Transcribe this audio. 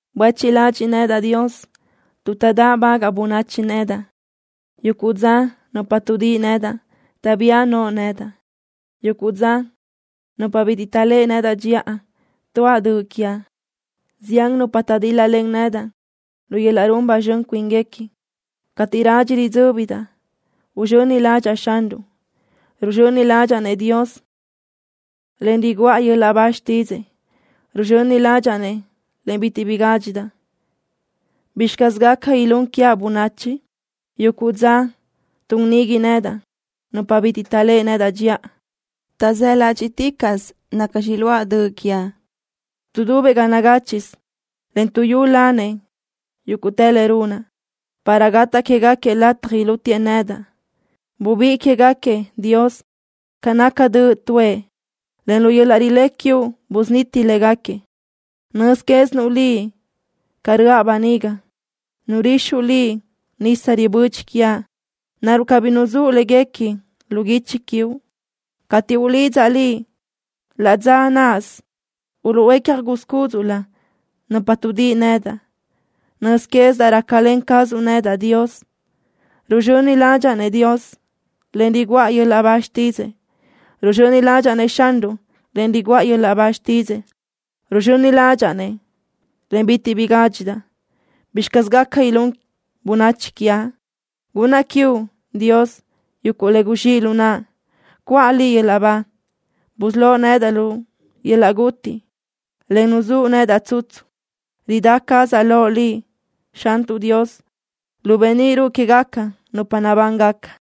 Buéchiʼ ladxiʼ nedaʼ, Dios, tuʼ taʼdáʼbagaʼ bönachi nedaʼ. Yuguʼ dza nupa tuʼdíʼi nedaʼ taʼbía no nedaʼ. Yuguʼ dza nupa bitiʼ taʼléʼe nedaʼ dxiʼa tuáʼ döʼ quiaʼ. Zián nupa taʼdíl-lalen nedaʼ lu yöl-laʼ run ba zxön cuínguequi. Cateʼ radxi ridzö́bidaʼ, uzxöni ládxaʼa Xanruʼ. Ruzxöni ládxaʼa-nëʼ Dios, en riguʼa yöl-laʼ ba xtídzëʼë. Ruzxöni ládxaʼa-nëʼ, en bitiʼ bi gádxidaʼ. ¿Bizxi caz gaca ilún quiaʼ bönachi? Yuguʼ dza tun nigui nedaʼ nupa bitiʼ taʼléʼe nedaʼ dxiʼa. Taʼzáʼ ládxiʼticaʼsö nacxi iluáʼ döʼ quiaʼ. Tuʼdubëʼ ga nagáchiʼsö, en tuʼyúlanëʼ yúguʼtë le runaʼ, para gataʼ quégaquiëʼ lataj ilútiëʼ nedaʼ. Bubiʼë quégaquiëʼ, Dios, ca naca döʼ tuʼë, en lu yöl-laʼ rilé quiuʼ busuniti légaquiëʼ. Nöz quézinuʼ Liʼ ca röʼa böniga. Nurixuʼ Liʼ nisa ribödxi quiaʼ. ¿Naruʼ cabí nuzúʼ léguequi lu guichi quiuʼ? Cateʼ ulidzaʼ Liʼ, laʼ dza náʼasö uluʼhuécja gúz cúdzuʼlö nupa tuʼdíʼi nedaʼ. Nöz quézidaʼ rácalen cazuʼ nedaʼ, Dios. Ruzxöni ládxaʼa-nëʼ Dios, en riguʼa yöl-laʼ ba xtídzëʼë. Ruzxöni ládxaʼa-nëʼ Xanruʼ, en riguʼa yöl-laʼ ba xtídzëʼë. Ruzxöni ládxaʼa-nëʼ, en bitiʼ bi gádxidaʼ. ¿Bizxi caz gaca ilún bönachi quiaʼ? ¡Gunnaʼ quiuʼ, Dios yuguʼ le guzxíʼ lu naʼa! ¡Cuʼa Liʼ yöl-laʼ ba! Busölóʼ nedaʼ lu yöl-laʼ guti, en nuzúʼ nedaʼ tsutsu. Ridá cazaʼ loʼ Liʼ, Xantuʼ Dios, lu beníʼ ruʼu quégaca nupa nabángaca.